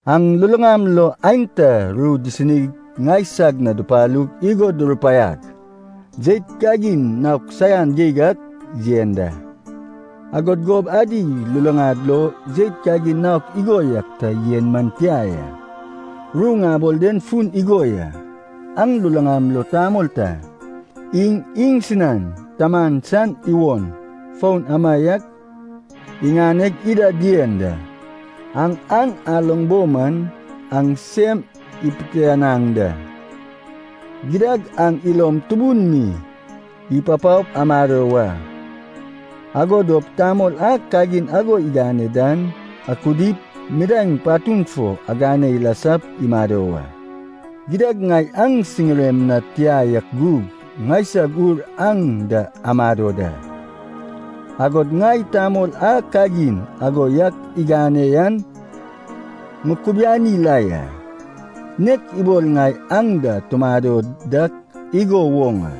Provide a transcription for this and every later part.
Aŋ luluŋam lo aenta ru disinig ŋaisag na dupalug igo durupaiag, jeit kagin naok saian geig ak yen da. Agod gob adi luluŋad lo jeit kagin naok igo yak ta yen man tia ya. Ru ŋabol den fun igo ya, aŋ luluŋam lo tamol ta iŋ iŋsinan taman san iwon foun amaiak iŋaneg ida dien da. Aŋ an aloŋ bo man, aŋ sem ipitianaŋ da! Gidad aŋ ilom tubun mi ipapaop amado wa. Ago dop tamol a kagin ago igane dan akudip midaeŋ patun fo agane ilasap imado wa. Gidad ŋai aŋ siŋirem na tia yak gug ŋaisag ur aŋ da amado da. Agod ŋai tamol a kagin ago yak igane yan ŋukubiani la ya, nek ibol ŋai aŋ da tumado dak igo woŋ a.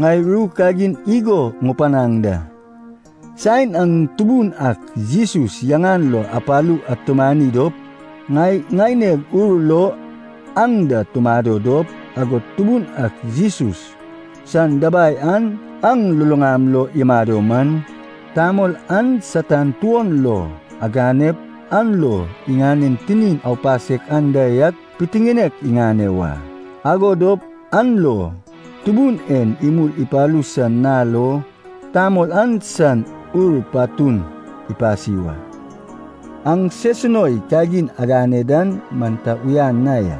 Ŋai ru kagin igo ŋupanaŋ da. Saen aŋ Tubun ak Jesus yaŋan lo apalu atumani dop ŋai ŋaineg ur lo aŋ da tumado dop, agod Tubun ak Jesus san dabai an aŋ luluŋam lo imado man, tamol an Satan tuon lo aganep an lo iŋanen tinin aupasek anda yak pitiŋinek iŋane wa. Ago dop an lo Tubun en imul ipalu san nal lo tamol an san ur patun ipasi wa. Aŋ sesunoi kagin agane dan man ta uyan na ya.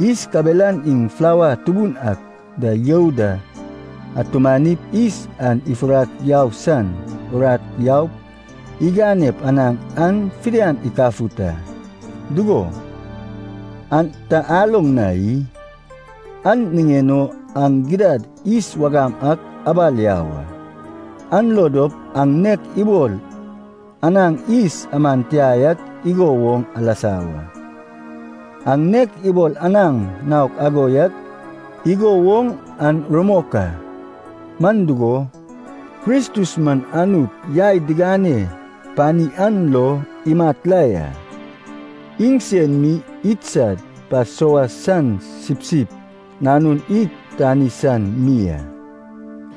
Yis kabelan iŋ flawa tubun ak da you da atumanip yis an ifurak yau san urat yaup iganep anaŋ an fidian ikafut a, dugo, an ta aloŋ na i? An niŋen o aŋ gidad yis wagam ak abal yau a, an lo dop aŋ nek ibol anaŋ yis aman tia yak igo woŋ alasa wa. Aŋ nek ibol anaŋ naok ago yak igo woŋ an rumok a. Man dugo, Kristus man Anut yai digane pani an lo imat la ya, iŋsen mi idsad Pasova san sipsip nanun id tani san mi a.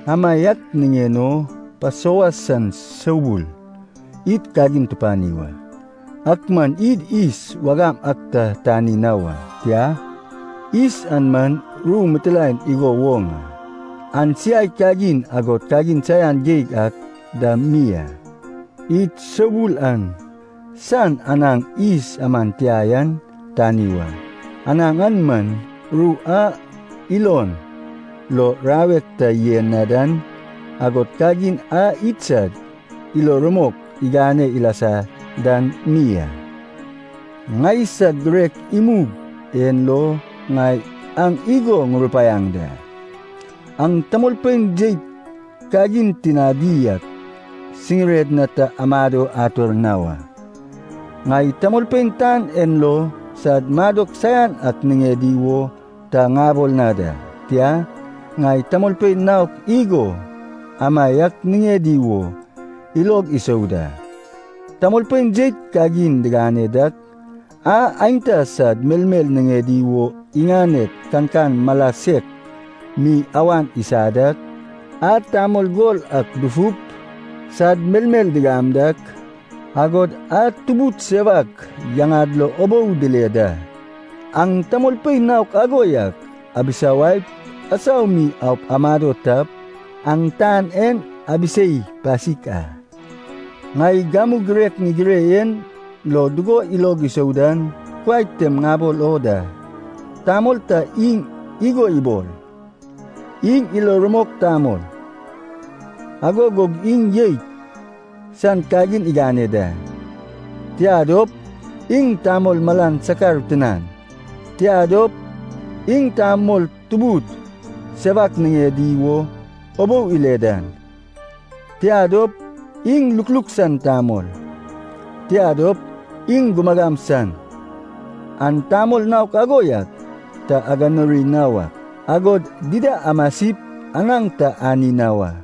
Amaiak niŋen o Pasova san soubul id kagin tupani wa. Ak man id yis wagam ak ta tani na wa, tia, yis an man ru mitilaen igo woŋ a, an siai kagin agod kagin saian geig ak dam mi a. Id soubul an san anaŋ yis aman tia yan tani wa, anaŋ an man, ru a ilon lo rawek ta yen na dan, agod kagin a idsad ilo rumok igane ilasa dan mi a. Ŋaisag girek imug en lo ŋai aŋ igo ŋurupaiaŋ da. Aŋ tamolpein jeit kagin tinadi ak siŋired na ta amado ator na wa. Ŋai tamolpein tan en lo sad madok saian ak niŋedi wo ta ŋabol na da. Tia, ŋai tamolpein naok igo amaiak niŋedi wo ilog isou da: tamolpein jeit kagin digane dak, a aenta sad melmel niŋedi wo iŋaned kankan mala sek mi awan isa dak, a tamol gol ak dufup sad melmel digam dak, agod a tubud sewak yaŋad lo ubou dile da. Aŋ tamolpein naok ago yak abisawaip asau mi aup amado tap, aŋ tan en abisei pasik a. Ŋai gamu girek ŋigire en lo dugo ilog isou dan kuai tem ŋabol o da. Tamol ta iŋ igo ibol, iŋ ilo rumok tamol, ago gug iŋ jeit san kagin igane da, tia dop, iŋ tamol malan sakar tinan, tia dop, iŋ tamol tubud sewak niŋedi wo ubou ile dan, tia dop, iŋ lukluk san tamol, tia dop, iŋ gumagam san, aŋ tamol naok ago yak ta aganuri na wak, agod dida amasip anaŋ ta ani na wa.